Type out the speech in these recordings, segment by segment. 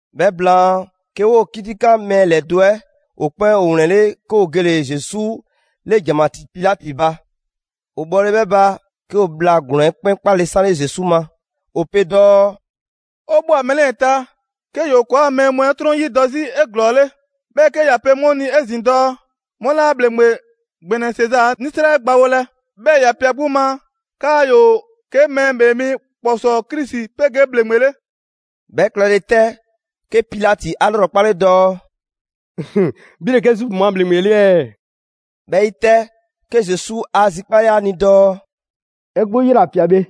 'Bhɛ blaan, 'ke 'woo‑ 'kitikan mɛɛ ‑lɛdo' 'ɛ ‑o 'kpɛn ‑o ‑wlɛnle', 'ke ‑o gele‑ Zesu 'le ‑Janmatii Pilati ba. ‑O bhɔle 'bhɛ ba, 'ke ‑o bhla ‑glɔɔn 'ɛ 'kpɛn 'kpale‑ 'sanle Zesu ma. ‑O pe dɔɔ: «'O ꞊bhwa mɛɛ 'lɛɛ‑ ta 'ke ‑yoo ‑kɔɔa' mɛɛ mu 'ɛ 'trɔn 'yidɔ‑ 'zi 'eglɔɔle, 'bhɛɛ‑ 'ke ‑ya pe 'mu ni 'ezin‑ dɔɔ 'mu 'laa ‑bhleŋgbe ‑gbɛnɛ Sezaa a 'nisra 'ɛ gbawolɛ. 'Bhɛɛ‑ ‑ya pe ‑a 'gbu ma 'kaa ‑yoo 'ke Mɛɛ ‑Bhee Mi ‑kpɔsɔɔ Krisi 'pegee ‑bhleŋgbe 'le.» 'Bhɛ klɛle 'tɛ, 'ke Pilati 'a 'lrɔkpale dɔɔ: «'Bhi ‑le 'ke Zuufu mu a ‑bhleŋgbe 'ɛ 'le ɛɛ?» 'Bhɛ 'yi 'tɛ, 'ke Zesu 'a zikpale 'a ni dɔɔ: «'E 'gbu 'yela‑ ꞊pia bhe.»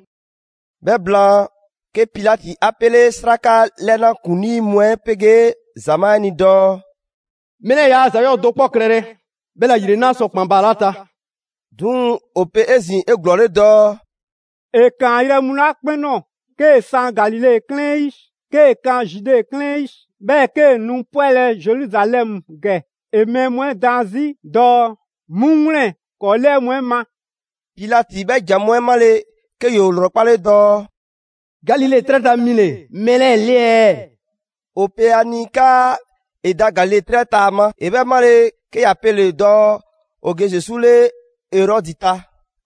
'Bhɛ blaan, 'ke Pilati 'a 'pele 'sraka 'lɛna ‑kuŋlii mu 'ɛ 'pegee ‑zamaa' 'ɛ ni dɔɔ: «Mɛɛ 'lɛɛ‑ yaa ‑za 'yɔɔ do 'kpɔ klɛlɛ, 'bhɛla‑ ‑yile 'naa sɔ ‑kpan baale' 'a ta.» 'Duŋ‑ ‑o pe 'ezin‑ 'eglɔɔle dɔɔ: «‑E ‑kaan yrɛ mu 'la 'kpɛn ꞊nɔɔ: 'Kee‑ san Galile 'klɛɛn 'ɛ 'yi, 'kee‑ ‑e kan Zude 'klɛɛn 'ɛ 'yi, 'bhɛɛ‑ 'kee‑ nu 'pwɛlɛ‑ Zeruzalɛmu ‑gɛ, ‑e mɛɛ mu 'ɛ daan 'zi dɔɔ 'mu 'wlɛn ‑kɔɔ' 'lɛɛ mu 'ɛ ma.» Pilati 'bhɛ ‑jan mu 'ɛ 'male‑, 'ke ‑yoo ‑lrɔkpale dɔɔ: «Galile 'trɛ ta mi ‑le mɛɛ 'lɛɛ‑ 'le ɛɛ?» ‑O pe a ni 'kaa ‑e da Galile 'trɛ ta ‑a ma. ‑E 'bhɛ 'male‑, 'ke ‑ya pele‑ dɔɔ ‑o ge Zesu 'le Erɔdi ta,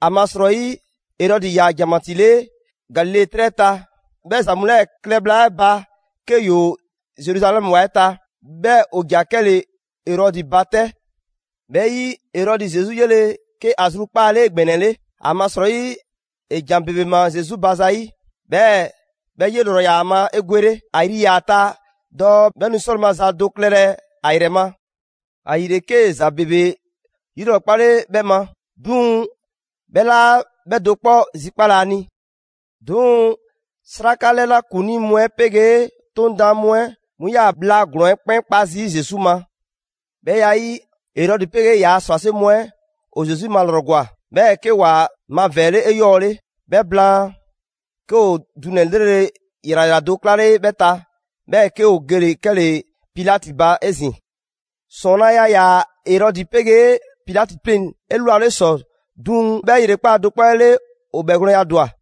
‑amasrɔyi Erɔdi ‑yaa ‑janmatii 'le 'yee‑ Galile 'trɛ 'ɛ ta, 'bhɛɛ‑ ‑za mu 'lɛɛ‑ klɛ bhla 'ɛ ba 'ke ‑yoo Zeruzalɛmu ‑wa 'ɛ ta. 'Bhɛɛ‑ ‑o ‑ja 'kɛle‑ Erɔdi ba 'tɛ. 'Bhɛ 'yi, Erɔdi Zesu 'yele‑, 'ke ‑a zrukpaale 'egbɛnɛle. ‑Amasrɔyi ‑e ‑jan ‑bebe ꞊maa Zesu ba zayi', 'bhɛɛ‑ 'bhɛ 'ye ‑lrɔ ‑yaa ‑a ma 'egwele. ‑A yri ‑yaa ‑a ta dɔɔ 'bhɛ nu 'sɔle‑ maza do klɛlɛ ‑a ‑yrɛ ma. ‑Ayile, 'kee‑ ‑za ‑bebe 'yilrɔkpale 'bhɛ ma, 'duŋ‑ 'bhɛ 'laa 'bhɛ do 'kpɔ zikpalɛ a ni. 'Duŋ‑, 'sraka 'lɛna ‑kuŋlii mu 'ɛ 'pegee 'Toŋ daan mu 'ɛ 'mu 'yaa‑ bhla ‑glɔɔn 'ɛ 'kpɛn 'kpa zii' Zesu ma. 'Bhɛ ya 'ɛ 'yi, Erɔdi 'pegee ‑yaa' ‑srwase' mu 'ɛ ‑o Zesu malrɔgwa, 'bhɛɛ‑ 'ke ‑wa mavɛɛle 'eyɔɔle. 'Bhɛ blaan, 'ke ‑o dunɛ‑ 'lrele‑ ‑yrayra do 'klale 'bhɛ ta, 'bhɛɛ‑ 'ke ‑o gele‑ 'kɛle‑ Pilati ba 'ezin‑. ‑Sɔɔnaya ‑yaa Erɔdi 'pegee Pilati 'pleŋ‑ 'elwale ‑sɔ, 'duŋ‑ 'bhɛ ‑yrekpaa' do 'ɛ le ‑o bhɛgwlɛnya ‑dwa.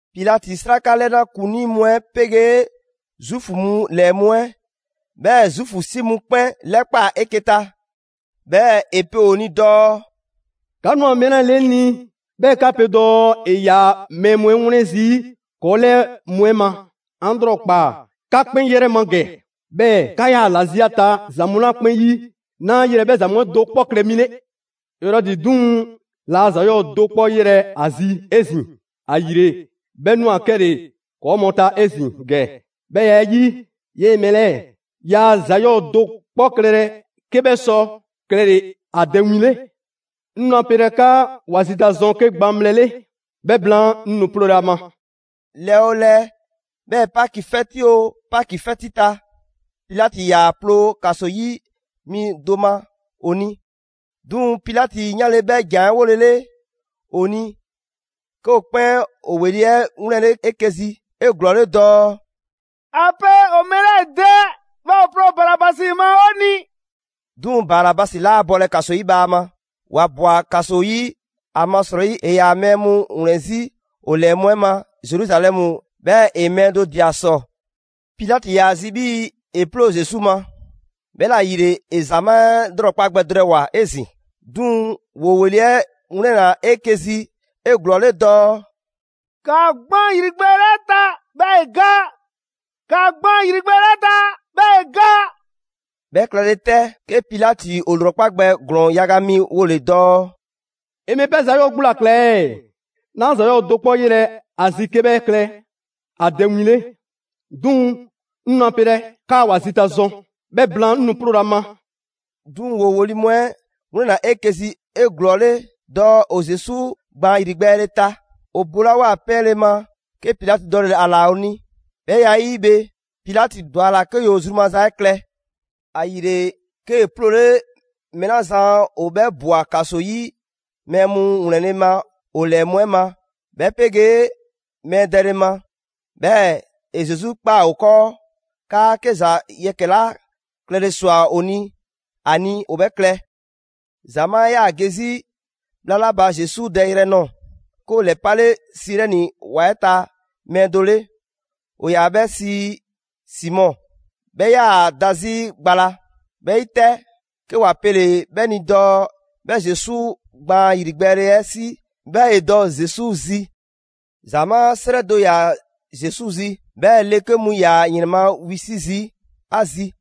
Pilati 'sraka 'lɛna ‑kuŋlii mu 'ɛ 'pegee Zuufu mu ‑lɛɛ mu 'ɛ, 'bhɛɛ‑ Zuufu 'si mu 'kpɛn 'lɛkpaa‑ 'eke‑ ta. 'Bhɛɛ‑ ‑e pe ‑o ni dɔɔ: «'Ka ꞊nwa mɛɛ 'lɛɛ‑ 'le 'ŋ ni, 'bhɛɛ‑ 'ka pe dɔɔ ‑e ‑yaa mɛɛ mu 'ɛ 'wlɛn zii' ‑kɔɔ' 'lɛɛ mu 'ɛ ma. 'An 'lrɔkpaa‑ 'ka 'kpɛn 'yrɛ ma ‑gɛ. 'Bhɛɛ‑ 'ka 'yaa‑ ‑la 'zi 'a ta ‑za mu 'la 'kpɛn 'yi, 'naa 'a 'yelɛ‑ 'bhɛ ‑za mu 'ɛ do 'kpɔ klɛ mi 'le. Erɔdi 'duŋ‑, 'laa ‑za 'yɔɔ‑ do 'kpɔ 'yelɛ‑ ‑a zi 'ezin‑, ‑ayile 'bhɛ ꞊nwa 'kɛle‑ ‑kɔɔ' mu ta 'ezin‑ ‑gɛ. 'Bhɛ ya 'ɛ 'yi, 'yee‑ mɛɛ 'lɛɛ‑ yaa ‑za 'yɔɔ‑ dɔ 'kpɔ klɛlɛ 'ke 'bhɛ sɔ klɛle‑ a dɛ win 'le. 'Ŋ nu a pelɛ 'kaa ‑wa zita zɔn 'ke gbaŋbhlɛ 'le, 'bhɛ blaan 'ŋ nu 'ploolɛ‑ ‑a ma.» [Lɛɛ 'oo lɛɛ, 'bhɛɛ‑ Paki 'fɛti oo Paki 'fɛti ta, Pilati ‑yaa ploo ‑kaso 'yi mi do ma ‑o ni.] 'Duŋ‑ Pilati 'yanle‑ 'bhɛ ‑jan 'ɛ 'wolele ‑o ni, 'ke ‑o 'kpɛn ‑o ‑weli' 'ɛ 'wlɛnle 'eke‑ zi 'eglɔɔle dɔɔ: «‑A pe ‑o mɛɛ 'lɛɛ‑ dɛ, 'bhɛɛ‑ ‑o 'ploo Barabasi ma 'o ni!» 'Duŋ‑ Barabasi 'laa bɔlɛ ‑kaso 'yi bhaama. ‑Wa ꞊bwa ‑kaso 'yi, ‑amasrɔyi ‑e ‑yaa mɛɛ mu ‑wlɛn 'zi ‑o ‑lɛɛ mu 'ɛ ma Zeruzalɛmu, 'bhɛɛ‑ ‑e mɛɛ do ‑dia ‑sɔ. Pilati ‑yaa ‑a zi 'bhii‑ ‑e 'ploo Zesu ma, 'bhɛla‑ ‑yile ‑e ‑zamaa' 'ɛ 'lrɔkpa gbɛ drɛɛwoa‑ 'ezin‑. 'Duŋ‑ ‑woo ‑weli' 'ɛ 'wlɛnna‑ 'eke‑ zi 'eglɔɔle dɔɔ: «‑Kaa gbaan ‑yrigbɛɛle 'ɛ ta, 'bhɛɛ‑ ‑e ga; ‑kaa gbaan ‑yrigbɛɛle 'ɛ ta 'bhɛɛ‑ ‑e ga!» 'Bhɛ klɛle 'tɛ, 'ke Pilati ‑o ‑lrɔkpa' gbɛ ‑glɔɔn yaga mi ‑wole dɔɔ: «‑E ‑mɛ pɛ ‑za 'yɔɔ‑ 'gbu ‑la ‑kla ɛɛ? 'Naa ‑za 'yɔɔ‑ do 'kpɔ 'yelɛ‑ ‑a zi 'ke 'bhɛ klɛ ‑a dɛ win 'le. 'Duŋ‑ 'ŋ nu a pelɛ 'kaa ‑wa zita zɔn, 'bhɛ blaan 'ŋ nu 'ploolɛ‑ ‑a ma.» 'Duŋ‑ ‑woo ‑weli' mu 'ɛ 'wlɛnna‑ 'eke‑ zi 'eglɔɔle dɔɔ ‑o Zesu gbaan ‑yrigbɛɛle 'ɛ ta. ‑O ‑bolawoa 'pɛɛnle‑ ma 'ke Pilati dɔle‑ ‑a ꞊la ‑o ni. 'Bhɛ ya 'ɛ 'yi bhe, Pilati ‑dwa ‑a ‑la 'ke ‑yoo ‑o zru maza 'ɛ klɛ. ‑Ayile, 'kee‑ 'ploole mɛɛ 'la zan ‑o 'bhɛ ꞊bwa ‑kaso 'yi mɛɛ mu ‑wlɛnle' ma ‑o ‑lɛɛ mu 'ɛ ma, 'bhɛ 'pegee mɛɛ dɛle ma. 'Bhɛɛ‑ ‑e Zesu ꞊kpaa ‑o 'kɔɔ 'kaa 'ke ‑za yɛkɛ‑ 'la klɛle‑ ‑swa ‑o ni ‑a ni ‑o 'bhɛɛ‑ klɛ. ‑Zamaa' 'ɛ 'yaa‑ ge 'zi bhla 'la ba Zesu dɛyrɛ 'ɛ ꞊nɔɔ, 'ke ‑o ‑lɛpale Sirɛni ‑wa 'ɛ ta mɛɛ do 'le, ‑o ‑yaa 'bhɛ sii Simɔ, 'bhɛ ‑yaa da 'zi gba la. 'Bhɛ 'yi 'tɛ, 'ke ‑wa pele‑ 'bhɛ ni dɔɔ 'bhɛ Zesu gbaan ‑yrigbɛɛle 'ɛ 'si 'bhɛɛ‑ ‑e dɔ Zesu zi. ‑Zamaa' 'srɛ do ‑yaa Zesu zi, 'bhɛɛ‑ le 'ke mu ‑yaa ‑yrɛn ma wisi' zii' ‑a zi.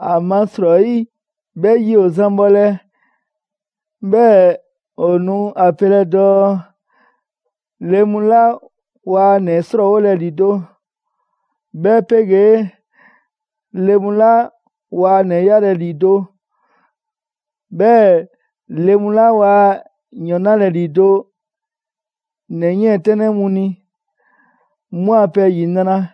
‑Amasrɔyi 'bhɛ yi ‑o zan bhɔlɛ, 'bhɛɛ‑ ‑o nu ‑a pelɛ dɔɔ: ‹Le mu 'la waa ‑nɛ 'srɔɔwolɛ ‑lido', 'bhɛ 'pegee le mu 'la waa ‑nɛ 'yalɛ‑ ‑lido', 'bhɛɛ‑ le mu 'la waa ‑yɔn 'nalɛ‑ ‑lido' ‑nɛ 'yiɛntɛnnɛ mu ni, 'mu a pɛ ‑yinra'!›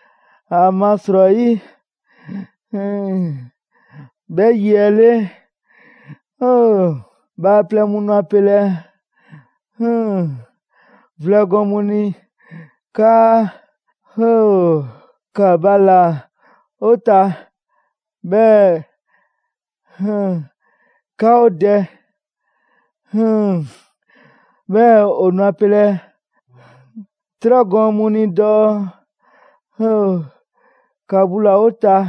‑Amasrɔyi 'bhɛ yi 'ɛ 'le, bhaaplɛŋ mu nu ‑a pelɛ vlɛ gɔɔn mu ni 'kaa: ‹‑Ka bala‑ 'o ta 'bhɛɛ‑ 'ka 'o dɛ!› 'Bhɛɛ‑ ‑o nu ‑a pelɛ 'trɛ gɔɔn mu ni dɔɔ: ‹‑Ka bhula‑ 'o ta!›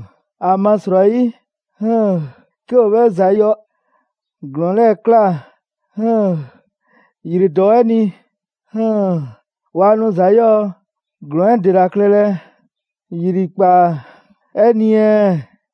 ‑Amasrɔyi 'ke ‑o 'bhɛ ‑za 'yɔɔ‑ ‑glɔɔn 'lɛɛ‑ ꞊kla ‑yri ‑dɔɔ 'ɛ ni; waa nu za 'yɔɔ‑ ‑glɔɔn 'ɛ ‑dela ‑la klɛlɛ ‑yri ‑kpaa 'ɛ ni ɛɛ?»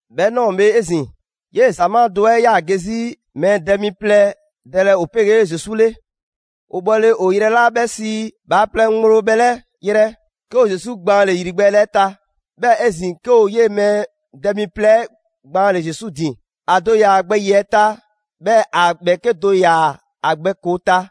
'Bhɛ ꞊nɔɔ bhe 'ezin‑, 'yee‑ ‑zamaa' do 'ɛ 'yaa‑ ge 'zi mɛɛ dɛ mi plɛ dɛlɛ ‑o 'pegee Zesu 'le. ‑O bhɔle ‑o yrɛ 'la ‑o 'bhɛ sii: ‹Bhaaplɛŋ ŋgblo bhɛlɛ' yrɛ›, 'ke ‑o Zesu gbaanle‑ ‑yrigbɛɛle 'ɛ ta. 'Bhɛɛ‑ 'ezin‑, 'ke ‑o 'yee‑ mɛɛ dɛ mi plɛ 'ɛ gbaanle‑ Zesu ‑din: ‑A do ‑yaa ‑a gbɛ ‑yiɛ' ta, 'bhɛɛ‑ ‑a ‑bhɛɛke' do 'ɛ 'yaa‑ ‑a gbɛ ‑koo ta.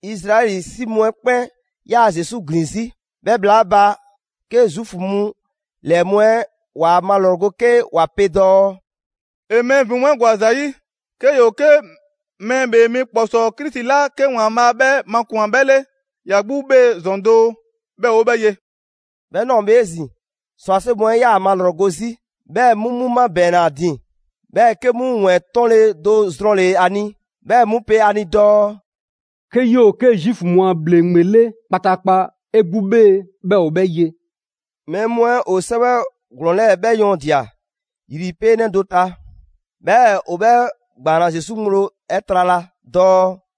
Izraɛli 'si mu 'ɛ 'kpɛn 'yaa‑ Zesu ‑glin 'zi. 'Bhɛ bhla 'ɛ ba, 'ke Zuufu mu ‑lɛɛ mu 'ɛ ‑wa malrɔgo 'ke ‑wa pe dɔɔ: «‑E mɛɛ ‑vin mu 'ɛ ‑gwa ‑za ‑yi, 'ke ‑yoo 'ke Mɛɛ ‑Bhee Mi ‑kpɔsɔɔ Krisi 'la 'ke ‑Waanbhaa' 'bhɛ makwan‑ 'bhɛ 'le, ‑ya 'gbu 'bhee‑ ‑zɔn doo, 'bhɛɛ‑ 'o 'bhɛ ye!» 'Bhɛ ꞊nɔɔ bhe 'ezin‑, ‑srwase' mu 'ɛ 'yaa‑ ‑a malrɔgo 'zi. 'Bhɛ mu 'mu 'mabɛɛnna ‑a ‑din, 'bhɛɛ‑ 'ke 'mu ‑wɛɛn 'tɔnle‑ do zrɔnle‑ ‑a ni, 'bhɛɛ‑ 'mu pe ‑a ni dɔɔ: «'Kee 'yoo‑ 'ke Zuufu mu a ‑bhleŋgbe 'le kpataakpa, 'e 'gbu 'bhee‑, 'bhɛɛ‑ 'o 'bhɛ ye!» Mɛɛ mu 'ɛ ‑o 'sɛwɛ ‑glɔɔn 'lɛɛ‑ 'bhɛ yɔɔndia‑ ‑yri 'peenɛ do ta, 'bhɛɛ‑ ‑o 'bhɛ ‑gbaanna Zesu ŋgblo 'ɛ trala dɔɔ: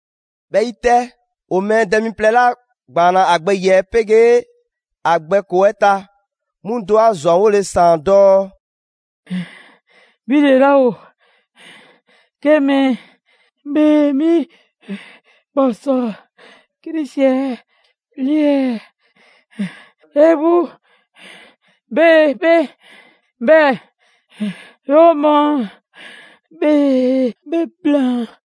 'Bhɛ 'yi 'tɛ, ‑o mɛɛ dɛ mi plɛ 'la ‑gbaanna ‑a gbɛ ‑yiɛ' 'pegee ‑a gbɛ ‑koo 'ɛ ta, 'mu do 'a ‑zwanwole ‑saan dɔɔ: «'Bhi ‑le 'laa ‑o 'ke Mɛɛ ‑Bhee Mi ‑kpɔsɔɔ Krisi 'ɛ 'le ɛɛ? 'E 'gbu 'bhee‑ 'pe, 'bhɛɛ‑ 'yoo mɔɔ bhee 'bhɛ blaan!»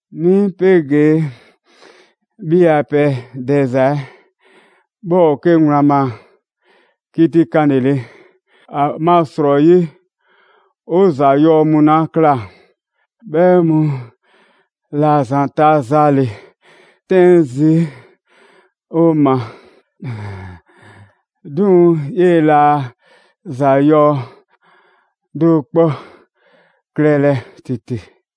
'Mi 'pegee 'bhi a pɛ dɛza 'ɛ, 'bhɛ ‑o 'ke wlan ma 'kitikanle 'le. ‑Amasrɔyi 'o ‑za 'yɔɔ‑ mu 'la ꞊kla, 'bhɛ mu ‑la ‑zanta' za ‑le 'tɛn zii' 'o ma. 'Duŋ‑ 'yee‑ 'laa ‑za 'yɔɔ‑ do 'kpɔ klɛlɛ ‑titi.»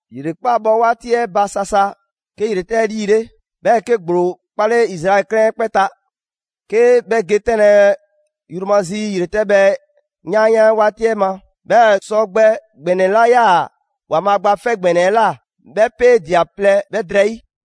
‑Yrekpaa' bhɔ 'waati 'ɛ ba sasa, 'ke ‑yretɛ' 'liile‑, 'bhɛɛ‑ 'ke ‑gblo 'kpale Izraɛli 'klɛɛn 'ɛ 'kpɛn ta, 'ke 'bhɛ ge 'tɛnlɛ‑ yromazi ‑yretɛbhɛ yanyan 'ɛ 'waati 'ɛ ma. 'Bhɛɛ‑ sɔgbɛ ‑gbɛnɛ 'la 'yaa‑ ‑Waanbhaa' Gba 'Fɛ ‑Gbɛnɛ 'ɛ ꞊la, 'bhɛ 'peedia‑ plɛ 'bhɛ drɛyi'.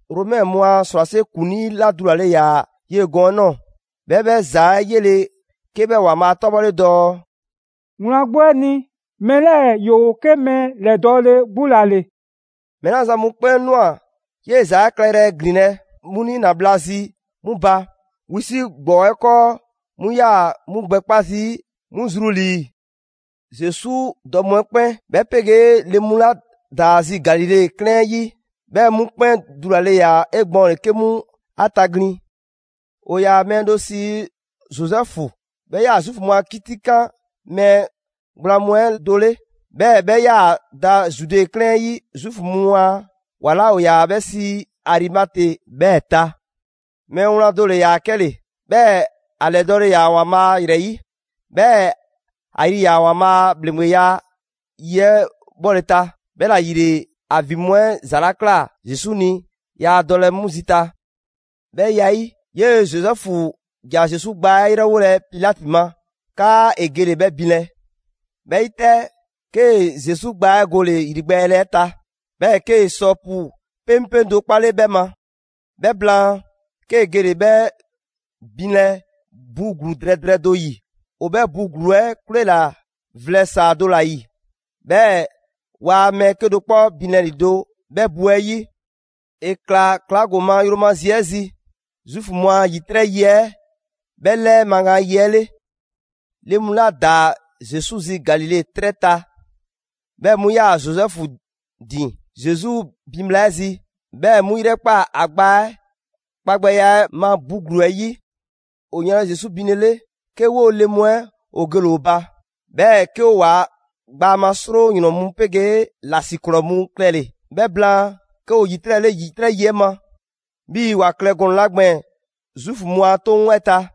Romɛ mu a ‑srwase' ‑kuŋlii 'la dulale ‑yaa 'yee‑ gɔn 'ɛ ꞊nɔɔ, 'bhɛ 'bhɛ ‑za 'ɛ 'yele, 'ke 'bhɛ ‑Waanbhaa' 'tɔbhɔle dɔɔ: «Wlan 'gbu 'ɛ ni, mɛɛ 'lɛɛ‑ 'yaa‑ 'ke mɛɛ ‑lɛdɔɔle 'gbu ‑la ‑le.» Mɛɛ 'la zan mu 'kpɛn ꞊nwa 'yee‑ ‑za 'ɛ klɛyrɛ ‑glinlɛ', 'mu 'niina‑ bhla zi 'mu ba, wisi' ‑gbɔɔ 'ɛ 'kɔɔ, 'mu 'yaa‑ 'mu gbɛ 'kpa zii' 'mu zru ‑lii. Zesu dɔ mu 'ɛ 'kpɛn, 'bhɛ 'pegee le mu 'la ‑daa ‑a zi Galile 'klɛɛn 'ɛ 'yi, 'bhɛ mu 'kpɛn dulale ‑yaa 'egbɔɔnle 'ke 'mu 'a taglin. ‑O ‑yaa mɛɛ do sii Zozɛfu. 'Bhɛ 'yaa‑ Zuufu mu a 'kitikan mɛɛ gblaan mu 'ɛ do 'le, 'bhɛɛ‑ 'bhɛ ‑yaa da Zude 'klɛɛn 'ɛ 'yi Zuufu mu a ‑wa 'la ‑o ‑yaa 'bhɛ sii Arimate 'bhɛɛ‑ ta. Mɛɛ wlan do ‑le ‑yaa 'kɛle‑, 'bhɛɛ‑ ‑a ‑lɛdɔɔle ‑yaa ‑Waanbhaa' ‑yrɛ 'yi. 'Bhɛɛ‑ ‑a yri ‑yaa ‑Waanbhaa' a ‑bhleŋgbeya yi 'ɛ 'bhɔle‑ ta. 'Bhɛla‑ ‑yile, ‑a ‑vin mu 'ɛ ‑za 'la ꞊kla Zesu ni, ‑yaa dɔlɛ 'mu zita. 'Bhɛ ya 'ɛ 'yi, 'yee‑ Zozɛfu ‑ja Zesu gbaa 'ɛ 'yrɛwolɛ Pilati ma, 'kaa ‑e gele‑ 'bhɛ binlɛ. 'Bhɛ 'yi 'tɛ, 'kee‑ Zesu gbaa 'ɛ gole‑ ‑yrigbɛɛle 'ɛ ta. 'Bhɛɛ‑ 'kee‑ sɔ 'pu 'peŋpeŋ do 'kpale 'bhɛ ma. 'Bhɛ blaan, 'kee‑ gele‑ 'bhɛ binlɛ bu ‑gluu drɛɛ drɛɛ do 'yi. ‑O 'bhɛ bu ‑gluu 'ɛ 'kwleela‑ vlɛ ‑saa do ‑la ‑yi, 'bhɛɛ‑ waa mɛɛ 'kedo‑ 'kpɔ binlɛ ‑lido' 'bhɛ bu 'ɛ 'yi. ‑E ‑kla ‑klaago ma yromazi 'ɛ zi, Zuufu mu a ‑yitrɛ' yi 'ɛ 'bhɛ 'lɛɛ magaan yi 'ɛ 'le. Le mu 'la ‑daa Zesu zi Galile 'trɛ ta, 'bhɛ mu ‑yaa Zozɛfu ‑din Zesu bin bhla 'ɛ zi. 'Bhɛɛ‑ 'mu ‑yrɛkpaa ‑a gbaa 'ɛ 'kpaagbɛya 'ɛ ma bu ‑gluu 'ɛ 'yi. ‑O yanle Zesu binlele, 'ke 'woo‑ le mu 'ɛ ‑o gele‑ ‑o ba; 'bhɛɛ‑ 'ke ‑wa gbaa ma 'sro ‑yrɔn mu 'pegee ‑lasiklɔɔ mu klɛle‑. 'Bhɛ blaan, 'ke ‑woo ‑yitrɛle ‑yitrɛ' yi 'ɛ ma, 'bhii‑ ‑wa klɛ gɔnɛ‑ 'la gbɛɛn‑ Zuufu mu a 'toŋ 'ɛ ta.